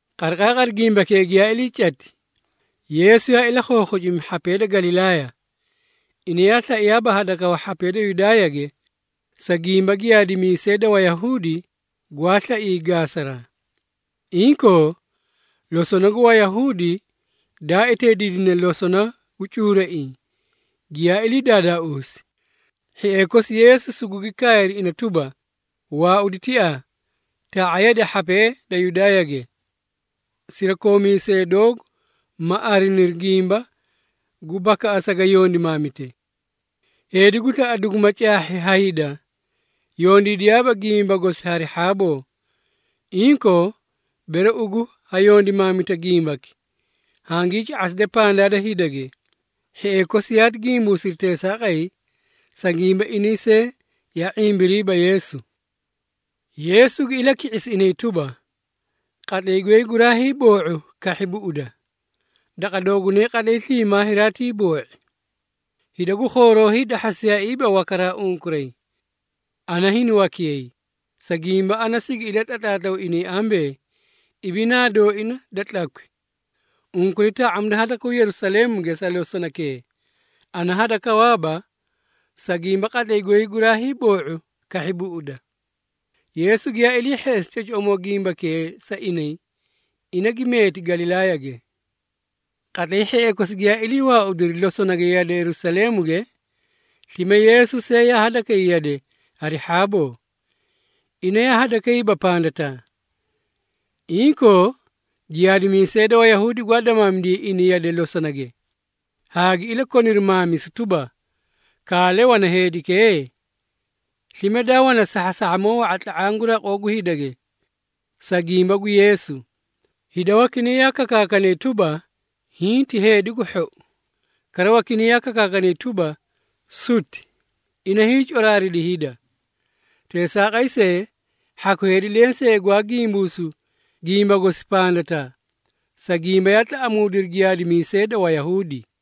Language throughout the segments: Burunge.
Qariqaaqari gimbakee giyaa ilii cati, Yeesu yaa ilakhookhocimi hhapee da Galilaaya. Ina yaa slaiyaaba hadakawa hhapee da Yudaayage, sa gimba giyaadimiisee da Wayahuudi gwaa slaiyay gaasaraa. Inkoo, losona gu Wayahuudi daa eteediidine losona gu cuuraiĩ giyaa ilii daadaauusi, hhiee kosi Yeesu sugugi kaayri ina tuba, “Waaudi tiaa, taa⁄a yade hhapee da Yudaayage, sirakoomiisee doogu ma ariniri gimba gu bakaꞌasa ga yondimaamite. Heedi gu slaꞌa duguma caahhi ha hida, yondiidiyaaba gimba gosi hari hhaaboo. Inkoo, bere ugu ha yondimaamita gimbaki, hangii ca⁄aside pandaa da hidage.” Hhiee kosi yaati gimbuusiri teesaaqay, sa gimba inay see yaa ⁄imbiriiba Yeesu. Yeesu gi ilaki⁄isi inay tuba, “Qatlay goy guraa hiiboo⁄u kahhi buꞌuda. Daqa doogunay qatlay sliimaa hiraatiiboo⁄i. Hida gu khooroo hiidahhasiyaaiiba wakaraa unkuray. Ana hini wakiyay, sa gimba ana sigi ilatlatlaatlaw inay ambee, ibinaa dooina da tlakwi. Unkuray taa⁄amida hadakaw Yerusaleemuge sa losonakee. Ana hadakawaaba, sa gimba qatlay goy guraa hiiboo⁄u kahhi buꞌuda.” Yeesu giyaa ilii hheꞌesi cocoꞌomoo gimbakee sa inay, ina gi meeti Galilaayage. Qatlay hhiee kosi giyaa ilii waaudiri losonage yade Yerusaleemuge, slime Yeesu see yaa hadakay yade hari hhaaboo. Ina yaa hadakayba pandataa. Inkoo, giyaadimiisee da Wayahuudi gwaa damaamidiyay ina yade losonage, haa gi ilakoniri maamisu tuba, “Kaale wana heedikee?” Slime daa wana saasahhamoo wa⁄a tla⁄aã gu raqoo gu hidage, sa gimba gu Yeesu. Hida wakinay yaa kakaakanay tuba, “Hiĩ ti heedi gu hhou.” Kara wakinay yaa kakaakanay tuba, “Suti! Ina hiicoraaridi hida.” Teesaaqay see, hhaku heedi lensee gwaa gimbuusu gimba gosi pandataa, sa gimba yaa tlaꞌamuudiri giyaadimiisee da Wayahuudi.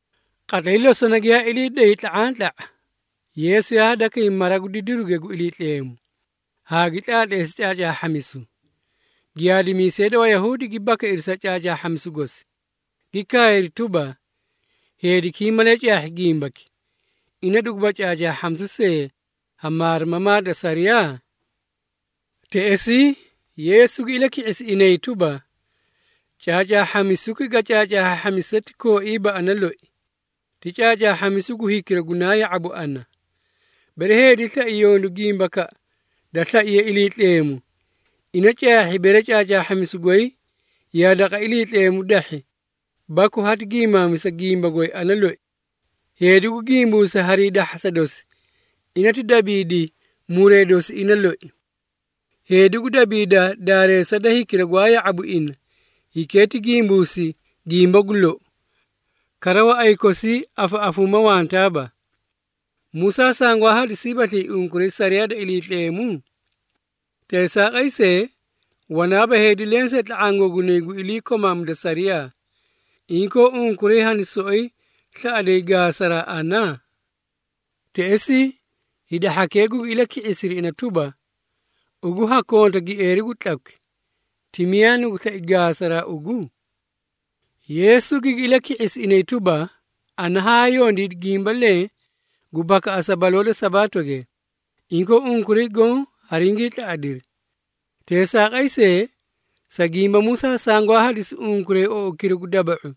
Qatlay losona giyaa ilii day tla⁄antla⁄a, Yeesu yaa hadakay mara gu didiruge gu Iliitleemu, haa gi tlaatleesi caacaahhamisu. Giyaadimiisee da Wayahuudi gi bakairi sa caacaahhamisu gosi, gi kaayri tuba, “Heediki hiĩ malee caahhi gimbaki, ina duguba caacaahhamisu see ha maarimamaa da sariyaa?” Teꞌesii, Yeesu gi ilaki⁄isi inay tuba, “Caacaahhamisuki ga caacaahhaahhamise ti kooiiba ana loi, ti caacaahhamisu gu hikira gunaa ya⁄abu ana. Bere heedi slai yondu gimbakaꞌa da slaiye Iliitleemu, ina caahhi bere caacaahhamisu goy yaa daqa Iliitleemu dahhi baku hati giimaamisa gimba goy ana loi. Heedi gu gimbuusa hari hiidahhasa dosi, ina ti dabiidi muree dosi ina loi. Heedi gu dabiida daareesa da hikira gwaa ya⁄abu ina, hikee ti gimbuusi gimba gu lou, kara waꞌay kosii afaꞌafuuma wantaaba. Musaa sangwaa hadisiibaslii unkuray sariyaa da Iliitleemu? Teesaaqay see, wanaaba heedi lensee tla⁄aã googunay gu iliikomaamida sariyaa. Inkoo, unkuray hani soꞌoyi slaꞌaday gaasaraa ana?” Teꞌesii, hida hhakee gugi ilaki⁄isiri ina tuba, “Ugu ha konta gieeri gu tlakwi! Ti miyaa nugu slai gaasaraa ugu?” Yeesu gigi ilaki⁄isi inay tuba, “Ana haa yondiidi gimba leẽ gu bakaꞌasa baloo da Sabaatoge, inkoo unkuray goõ haringii tlaꞌadiri. Teesaaqay see, sa gimba Musaa sangwaa hadisi unkuray oukira gu daba⁄u,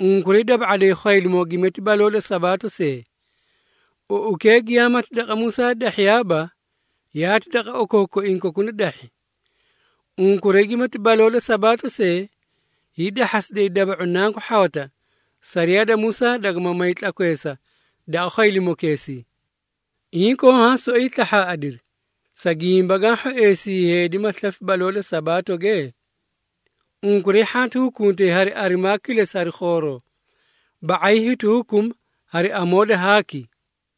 unkuray daba⁄aday khwaylimoo gimati baloo da Sabaato see. Oukee giyaamati daqa Musaa dahhiyaaba, yaati daqa okookoiĩ kokuna dahhi. Unkuray gimati baloo da Sabaato see, hiidahhasiday daba⁄u nanku hhawata, sariyaa da Musaa dagama may tlakweesa daqa khwaylimokeesii. Inkoo haã soꞌoyi slahhaaꞌadiri, sa gimba gaã hhoeesi heedi ma slafi baloo da Sabaatoge? Unkuray hhanti hukuntay hari arimaa kilesi hari khooroo, ba⁄ay hiti hukuma hari amoo da haaki.”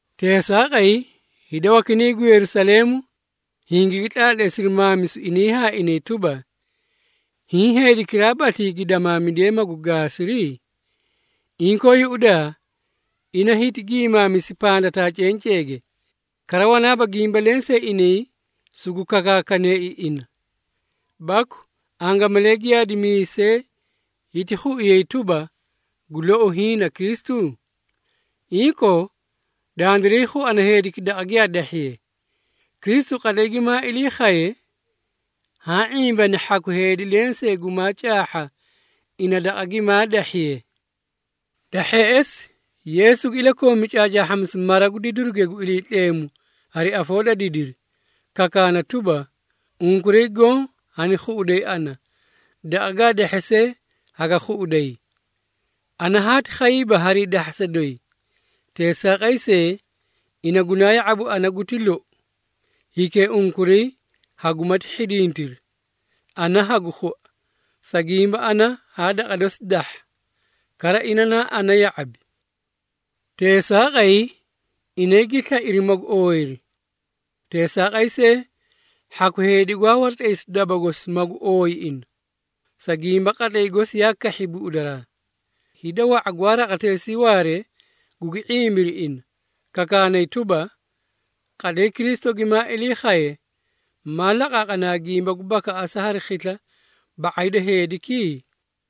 Teesaaqay, hida wakinay gu Yerusaleemu, hingaa tlaatleesiri maamisu inay haa inay tuba, “Hiĩ heedikiraabaslii gi damaamidiyee magu gaasiri? Inkoo yuꞌudaa, ina hiti gi maamisi pandataa cenceege, kara wanaaba gimba lensee inay sugu kakaakaneei ina. Baku angamalee giyaadimiisee hiti khuiyay tuba, gu lou hiĩ na Kristu? Inkoo, dandiray khuana heediki daqa giyaa dahhiye. Kristu, qatlay gimaa ilii khaye, haã ⁄imbani hhaku heedi lensee gumaa caahha ina daqa gimaa dahhiye.” Da hheꞌesi, Yeesu gi ilakoomi caacaahhamisu mara gu didiruge gu Iliitleemu hari afoo da didiri, kakaana tuba, “Unkuray goõ hani khuꞌuday ana, daqa gaa dahhe see haga khuꞌuday. Ana haati khayiiba harii dahhasa doyi. Teesaaqay see, ina gunaa ya⁄abu ana guti lou. Hikee unkuray hagumati hhidintiri, ana hagu khua, sa gimba ana haa daqa dosi dahha, kara ina naa ana ya⁄abi.” Teesaaqay inay gi slairi magu ooyiri. Teesaaqay see, hhaku heedi gwaa waratlaysu daba gosi magu ooyi ina, sa gimba qatlay gosi yaa kahhi buꞌudaraa. Hida wa⁄a gwaa raqateesii waaree gugi ⁄imbiri ina, kakaanay tuba, “Qatlay Kristu gimaa ilii khaye, maa laqaaqanaa gimba gu bakaꞌasa hari khisla, ba⁄ay da heediki?”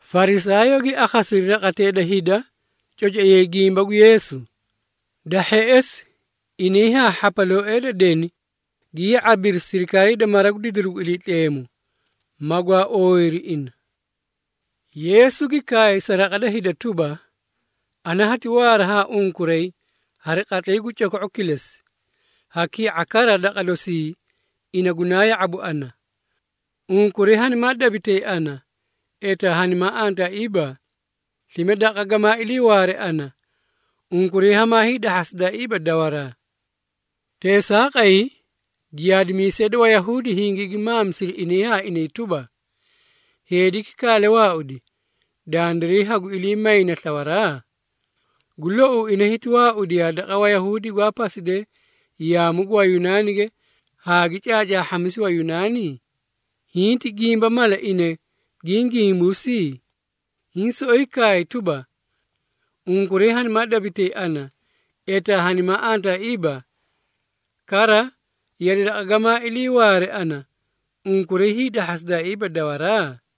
Farisaayoo gi akhasiri raqatee da hida cocoiyay gimba gu Yeesu. Da hheꞌesi, inay haa hhapalooee da deni gi ya⁄abiri sirikaarii da mara gu didiru gu Iliitleemu, magwaa ooyiri ina. Yeesu gi kaay sa raqa da hida tuba, “Ana hati waara ha unkuray hari qatlay gu coko⁄u kilesi, ha ki⁄a kara daqa dosii ina gunaa ya⁄abu ana. Unkuray hanimaa dabitay ana, etaa hanimaa antaaiiba, slime daqa gamaa iliiwaare ana, unkuray hamaa hiidahhasidaaiiba dawaraa.” Teesaaqay, giyaadimiisee da Wayahuudi hingigi maamisiri inay haa inay tuba, “Heediki kaale waaudi, dandiray haguiliimayne slawaraa? Gu louu ina hiti waaudiyaa daqa Wayahuudi gwaa pasidee yaamu gu Wayunaanige haa gi caacaahhamisi Wayunaani? Hiĩ ti gimba mala ina giĩ gimbuusi? Hiĩ soꞌoyi kaay tuba, ‘Unkuray hanimaa dabitay ana, etaa hanimaa antaaiiba, kara yade daqa gamaa iliiwaare ana, unkuray hiidahhasidaaiiba dawaraa?’”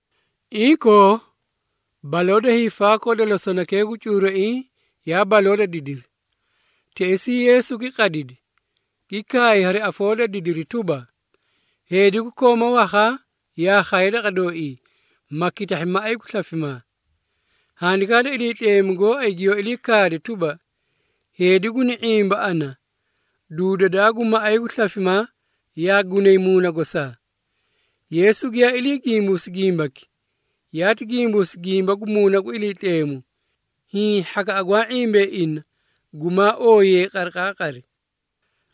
Inkoo, baloo da hiifaakoo da losonakee gu cuuraiĩ yaa baloo da didiri. Teꞌesii Yeesu gi qadidi, gi kaay hari afoo da didiri tuba, “Heedi gu kooma wakhaa yaa khaye daqa dooii, ma kitahhi maꞌay gu slafimaa. Handikaa da Iliitleemu gooay giyoó ilii kaade tuba, ‘Heedi guni ⁄imba ana, duudadaa gu maꞌay gu slafimaa yaa gunay muuna gosaa.’” Yeesu giyaa ilii gimbuusi gimbaki, yaati gimbuusi gimba gu Muuna gu Iliitleemu, hiĩ hhakaꞌa gwaa ⁄imbee ina gumaa ooyiyayi qariqaaqari.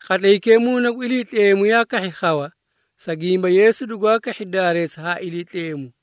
Qatlaykee Muuna gu Iliitleemu yaa kahhi khawa, sa gimba Yeesu dugwaa kahhi daareesa ha Iliitleemu.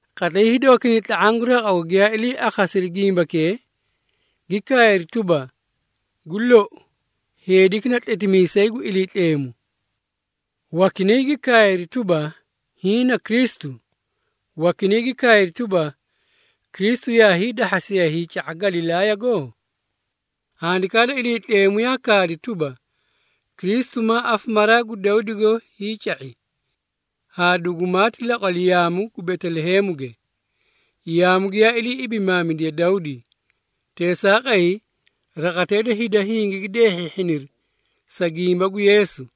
Qatlay hida wakinay tla⁄aã gu raqago giyaa ilii akhasiri gimbakee, gi kaayri tuba, “Gu lou, heediki na Tletimiisay gu Iliitleemu.” Wakinay gi kaayri tuba, “Hiĩ na Kristu!” Wakinay gi kaayri tuba, “Kristu yaa hiidahhasiyaa hiica⁄a Galilaayago? Handikaa da Iliitleemu yaa kaadi tuba, Kristu maa afamaraa gu Dawdigo hiica⁄i, haa dugumaati laqwali yaamu gu Beteleheemuge, yaamu giyaa ilii ibimaamidiye Dawdi.” Teesaaqay, raqatee da hida hingigi deehhiihhiniri sa gimba gu Yeesu.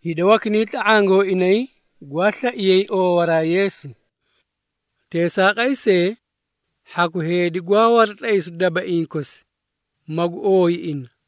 Hida wakinay tla⁄aã gooinay gwaa slaiyay oowaraa Yeesu. Teesaaqay see, hhaku heedi gwaa waratlaysu dabaiĩ kosi, magu ooyi ina.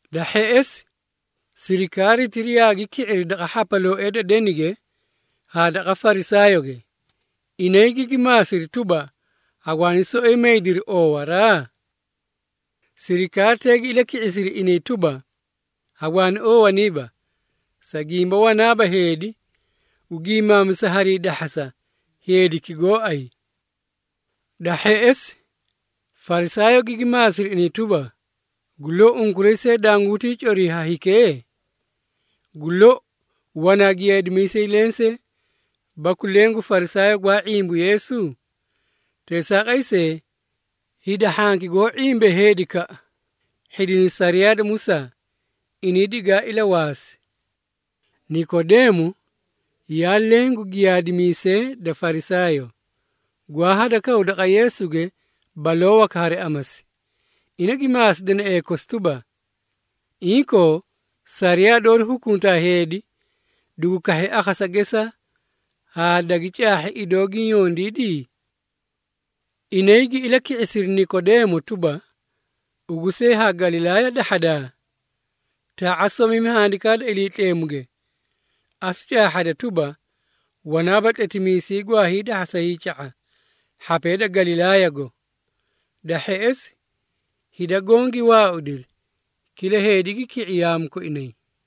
Da hheꞌesi, sirikaaritira yaagi ki⁄iri daqa hhapalooee da denige haa daqa Farisaayooge. Inay gigi maasiri tuba, “Hagwaani soꞌoyi maydiri oowaraa?” Sirikaaritee gi ilaki⁄isiri inay tuba, “Hagwaani oowaniiba, sa gimba wanaaba heedi gu giimaamisa hari hiidahhasa, heediki gooay!” Da hheꞌesi, Farisaayoo gigi maasiri inay tuba, “Gu lou, unkuray see danguntii corii ha hikee? Gu lou, wanaa giyaadimiisay lensee, baku leẽ gu Farisaayoo gwaa ⁄imbu Yeesu? Teesaaqay see, hida hhanki goó ⁄imbee heedikaꞌa, hhidinay sariyaa da Musaa. Inay digaa ilawaasi!” Nikodeemo yaa leẽ gu giyaadimiisee da Farisaayoo, gwaa hadakawu daqa Yeesuge baloo waka hari amasi. Ina gi maasi deneꞌee kosi tuba, “Inkoo, sariyaa doori hukuntaa heedi, dugu kahhi akhasa gesaa, haa dagi caahhi idoo giĩ yondiidi?” Inay gi ilaki⁄isiri Nikodeemo tuba, “Ugu see haa Galilaaya dahhadaa? Taa⁄a somimi Handikaa da Iliitleemuge, asu caahhada tuba, wanaaba tletimiisay gwaa hiidahhasa hiica⁄a, hhapee da Galilaayago!” [ Da hheꞌesi, hida goõ gi waaudiri, kila heedi gi ki⁄i yaamu koinay.